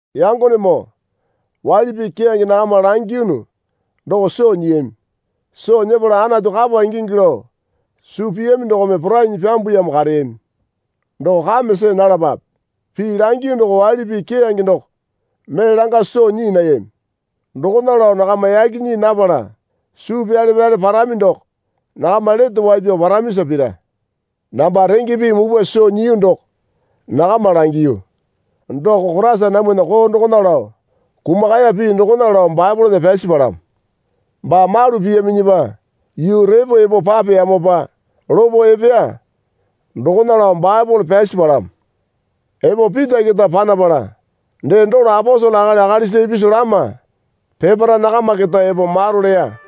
Yangonemoo waili pii keyange nakama langiyunu doko soo nyiyami. Soo nyepala Anatu kapa ingingi lao suu piyami dokome porainyi pyambuyamo kareyami. Doko kame see nalapape. Pii langiyu doko waili pii keyange doko mee langa soo nyii nayami. Dokona lao nakama yaki nyii napala suu pyale pyale parami doko nakama lete wai pyao paramisa pira. Namba renge pii mupwa soo nyiyu doko nakama langiyu. Doko Koraisa namwana koo dokona lao kumakaya pii dokona lao Baepolena pyasi palamo. Baa malu piyaminyipa yuu repo epo papeyamopa lopo epeya dokona lao Baepole pyasi palamo. Epo Pita keta panapala dee dolo aposele akali akalisa ipisu lama peparae nakama keta epo maro leya.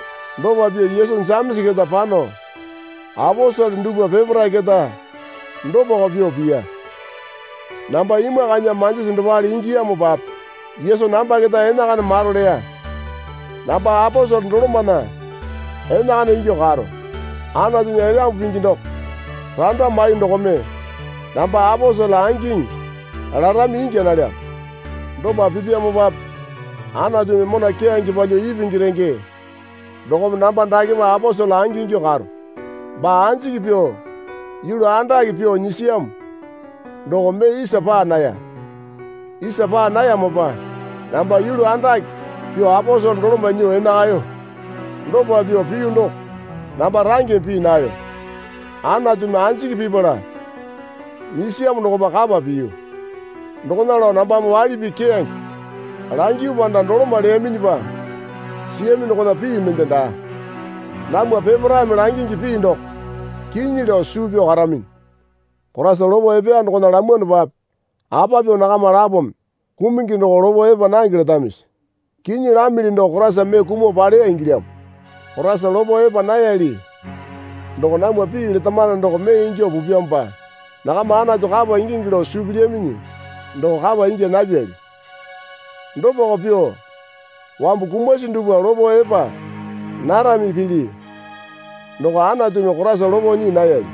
Dopa pyuo Yesu Jemesa keta pano aposele dupwa peparae keta dopako pyuo piya. Namba imwakainya manjisi dopale ingiyamopape Yesu namba keta enakana maro leya. Namba aposele dolomana enakana ingyuo karo. Anatunya Elyambu Pingi doko randa maiyuo dokome namba aposele angiŋi larami ingya nalyamo. Dopa pipyamopape Anatumi mona keyange palyuo ipingi renge dokome namba dakepa aposele angingyuo karo. Baa anjiki pyuo yulu andake pyuo nyisiyamo doko mee isa paa naya. Isa paa nayamopa namba yulu andake pyuo aposele doloma nyuo enakayo. Dopa pyuo piyu doko namba rangeme pii nayo. Anatumi anjiki pipala nyisiyamo dokopa kapa piyu. Dokona lao nambame waili pii keyange langiyu panda doloma leyaminyipa siyami dokona pii mende daa. Namwa peparaeme langingi pii doko kinyi lao suu pyao karaminyi. Koraisa lopo epeya dokona lamwanopape apa pyuo nakama lapome kumungi doko lopo epa nange letamisi? Kinyi lamili doko Koraisa mee kumuo paleya ingilyamo. Koraisa lopo epa nayali doko namwa pii letamano doko mee ingyuo pupyamopa nakama Anatu kapa ingingi lao suu pilyaminyi doko kapa ingya napyali. Dopako pyuo wambu kumasi dupwa lopo epa narami pili doko Anatumi Koraisa lopo nyii nayali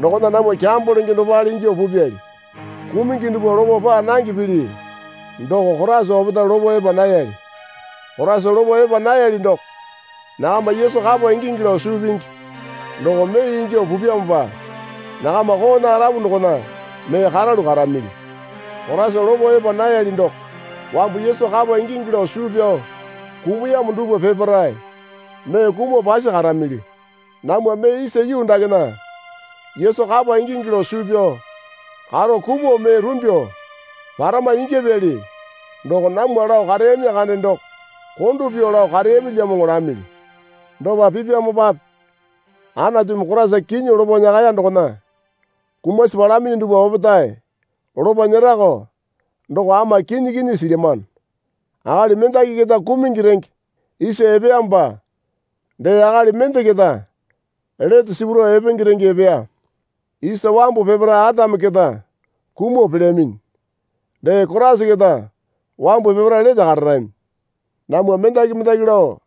dokona namwa kyambo lenge dopale ingyuo pupyali. Kumungi dupwa lopo paa nange pili doko Koraisa opetae lopo epa nayali. Koraisa lopo epa nayali doko nakama Yesu kapa ingingi lao suu pingi doko mee ingyuo pupyamopa nakama koona arapu dokona mee karalu karamili. Koraisa lopo epa nayali doko wambu Yesu kapa ingingi lao suu pyao kumuyamo dupwa peparae mee kumuo pasi karamili. Namwa mee isa yuu dakena Yesu kapa ingingi lao suu pyao karo kumuo mee rumbyuo parama ingyapyali doko namwa lao kareyami kande doko kondo pyuo lao kareyamilyamoŋo lamili. Dopa pipyamopape Anatumi Koraisa kinyi lopo nyakaya dokona kumasi palaminyi dupwa opetae lopo nyerako doko ama kinyi kinyi silyamano. Akali mendaki keta kumungi renge isa epeyamopa dee akali mende keta lete sipuro epenge renge epeya. Isa wambu peparae Atame keta kumuo pelyaminyi. Dee Koraisa keta wambu peparae lete kararami. Namwa mendaki mendaki lao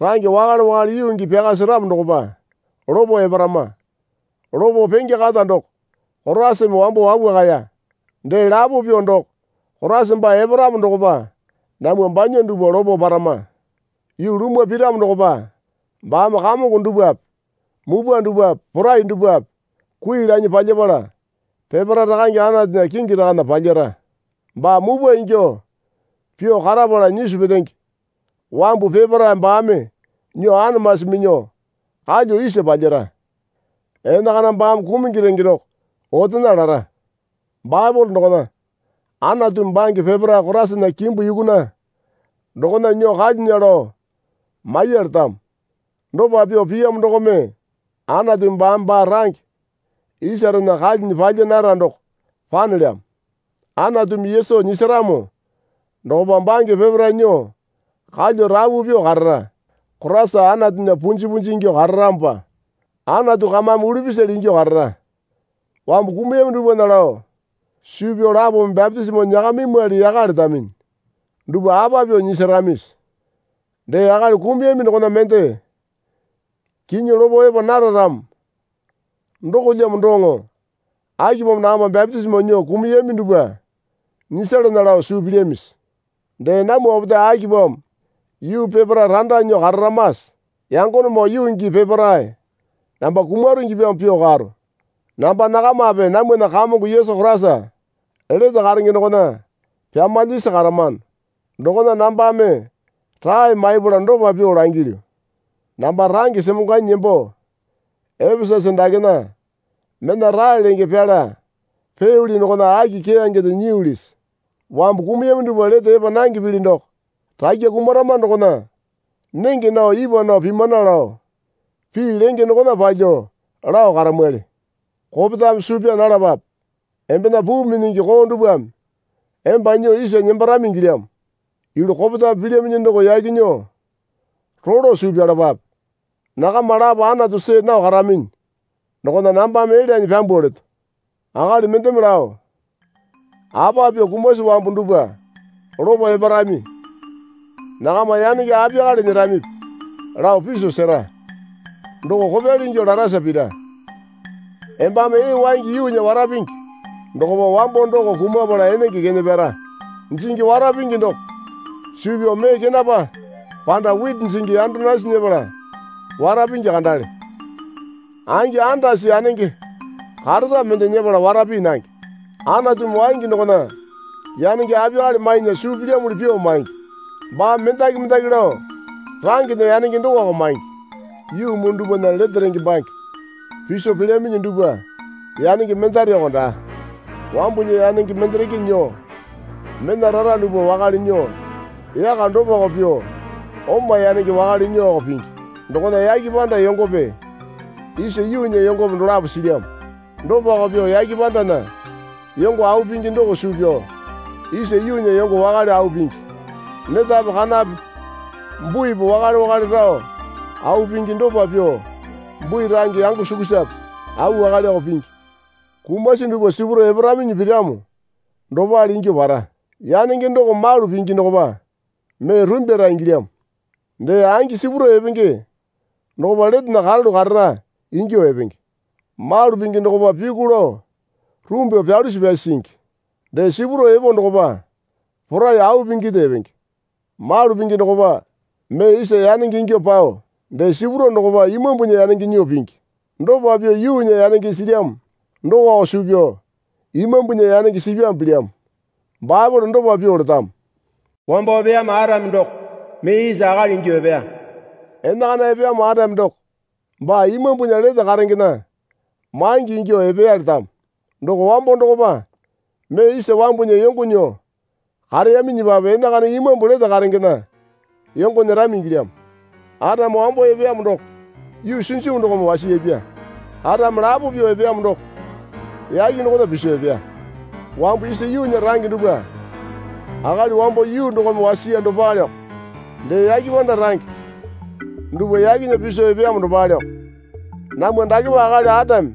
range wakale wakale yuu gii pyaka seramo dokopa lopo eparama. Lopo penge kata doko Koraisame wambo wapwakaya. Dee lapo pyuo doko Koraisa baa eparamo dokopa namwa banya dupwa lopo parama. Yuu lumwa piramo dokopa baame kamongo dupwape mupwa dupwape porai dupwape kui lanyi palyapala peparae Rakange Anatunya kingi rakana palyara. Baa mupwa ingyuo pyuo karapala nyisu petenge wambu peparae baame nyuo anamasi minyuo kalyuo isa palyara. Enakana baame kumungi renge doko otena lara. Baepole dokona, Anatumi bange peparae Koraisana kimbu yukuna dokona nyuo kalyunya lao maiya letamo. Dopa pyuo piyamo dokome Anatu baame baa range isarena kalyinya palya nara doko panelyamo. Anatumi Yesu nyisaramo dokopa bange peparae nyuo kalyuo rapu pyuo karara. Koraisa Anatunya punji punji ingyuo kararamopa Anatu kamame ulupisale ingyuo karara. Wambu kumuyami dupwana lao suu pyao lapome bapitisimo nyakamimwali yaka letaminyi dupwa apa pyuo nyisaramisi? Dee akali kumuyami dokona mende kinyi lopo epa nara ramo dokolyamo doŋo akipamo nakama bapitisimo nyuo kumuyami dupwa nyisalana lao suu pilyamisi? Dee namwa opetae akipamo yuu peparae randa nyuo kararamase? Yangonemoo yuu gii peparae namba kumaro ingyapyamo pyuo karo. Namba nakamape namwana Kamongo Yesu Koraisa lete karenge dokona pyamalyasi karamano dokona nambame rae maipala dopa pyuo langilyu. Namba range semongwanyi nembo Epesasa dakena mena rae lenge pyala peyoli dokona aki keyangende nyiyulisi? Wambu kumuyami dupwa lete epa nange pili doko, rakya kumarama dokona nenge nao ipwa nao pimana lao pii lenge dokona palyuo lao karamwali. Kopetame suu pyaa nalapape. Embena puu minyingi koo dupwame emba nyuo isa nembarami ingilyamo. Yulu kopetame pilyaminyi doko yaki nyuo rolo suu pyalapape. Nakama lapo Anatu see nao karaminyi dokona nambame elyanyi pyambuo leto. Akali mendeme lao, Apa pyuo kumasi wambu dupwa lopo eparami? Nakama yanenge apiyakale nyeramipi lao piso sera. Doko kopyali ingyuo larasa pira. Embame ee waingi yuunya wara pingi dokopa wambo doko kumapala enenge kene pyara. Jingi wara pingi doko suu pyao mee kenapa panda witi jingi yando nasi nyepala wara pingi kandale. Angi andasi yanenge kareta mende nyepala wara pii nange. Anatumi waingi dokona yanenge apiyakale mainya suu pilyamuli pyuo maingi. Baame mendaki mendaki lao rangena yanenge dokoko maingi. Yuu muu dupwana lete renge bange piso pelyaminyi dupwa yanenge mendareko daa. Wambunya yanenge mendereke nyuo mena rara dupwa wakale nyuo yaka dopako pyuo oma yanenge wakale nyuoko pingi. Dokona yake panda yongope isa yuunya yongope dolapo silyamo. Dopako pyuo yake pandana yongo au pingi doko suu pyao isa yuunya yongo wakale au pingi. Netape kanape buipi wakale wakale rao au pingi. Dopa pyuo bui range yango sukusape au wakaleko pingi. Kumasi dupwa sipuro eparaminyi piramo dopale ingyuo para. Yanenge doko malu pingi dokopa mee rumbyara ingilyamo. Dee angi sipuro epenge dokopa letena karalu karara ingyuo epenge. Malu pingi dokopa pyuku lao rumbyuo pyalusi pyasi singi. Dee sipuro epo dokopa porai au pinginde epenge. Malu pingi dokopa mee isa yanenge ingyuo pao dee sipuro dokopa imambunya yanenge nyuo pingi. Dopa pyuo yuunya yanenge silyamo dokoko suu pyao imambunya yanenge sipyamo pilyamo. Baepole dopa pyuo letamo. Wambo epeyamo Atame doko mee isa akali ingyuo epeya. Enakana epeyamo Atame doko baa Imambu lete karengena maingi ingyuo epeya letamo. Doko wambo dokopa mee isa wambunya yongo nyuo kareyaminyipape enakana imambu lete karengena yongo nyerami ingilyamo. Atame wambo epeyamo doko yuu sinjimu dokome wasiyapya. Atame lapo pyuo epeyamo doko yake dokona piso epeya. Wambu isa yuunya range dupwa akali wambo yuu dokome wasiya dopaleko. Dee yake panda range dupwa yakena piso epeyamo dopaleoko. Namwa dakepa akali Atame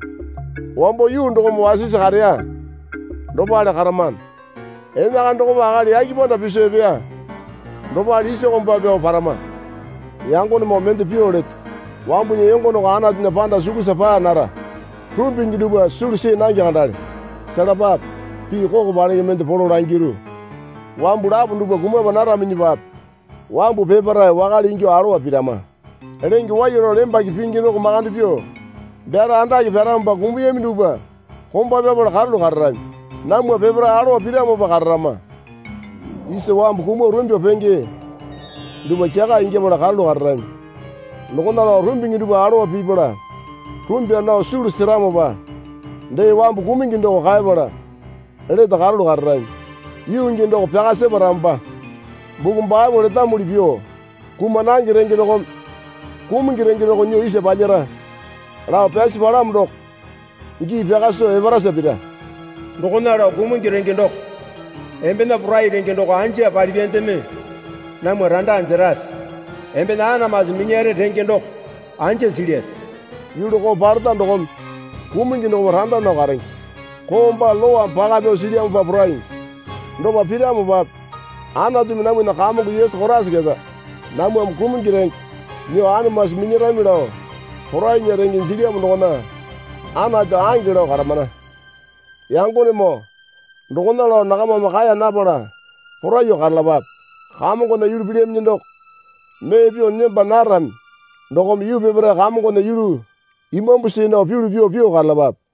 wambo yuu dokome wasisi kareya dopale karamano. Enakana dokopa akali yake panda piso epeya dopale isa komba pyao parama. Yangonemoo mende pyuo leto. Wambunya yongo doko Anatunya panda sukusa paa nara. Rumbingi dupwa sulu see nange kandale. Selapape, pii koko palenge mende polo langiru. Wambu lapo dupwa kumapa naraminyipape wambu peparae wakale ingyuo alowa pirama. Lenge waiya lao lembake pingi doko makande pyuo byara andake pyaramopa kumuyami dupwa komba pyapala karalu kararami. Namwa peparae alowa piramopa kararama. Isa wambu kumuo rumbyuo penge dupwa kyaka ingyapala karalu kararami. Dokona lao rumbingi dupwa alowa pipala rumbya nao sulu seramopa dee wambu kumungi doko kaepala lete karalu kararami. Yuu gii doko pyaka separamopa, buku Baepole letamuli pyuo kuma nange renge dokome kumungi renge doko nyuo isa palyara lao pyasi palamo doko gii pyaka soo eparasa pira. Dokona lao kumungi renge doko embena porai renge doko anja palipyandeme namwa randa jerase? Embena anamasi minyare renge doko anja silyase? Yulu koo paleta dokome kumungi dokopa randa nao karenge. Koo baa Lowame paka pyao silyamopa poraingi. Dopa piramopape Anatumi namwana Kamongo Yesu Koraisa keta namwame kumungi renge nyuo anamasi minyarami lao porainya renge jilyamo dokona Anatu ange lao karamana. Yangonemoo dokona lao nakamame kaeya napala poraiyuo karalapape. Kamongona yulu pilyaminyi doko mee pyuo nemba narami dokome yuu peparae Kamongona yulu imambu see nao pyulu pyuo pyuo karalapape.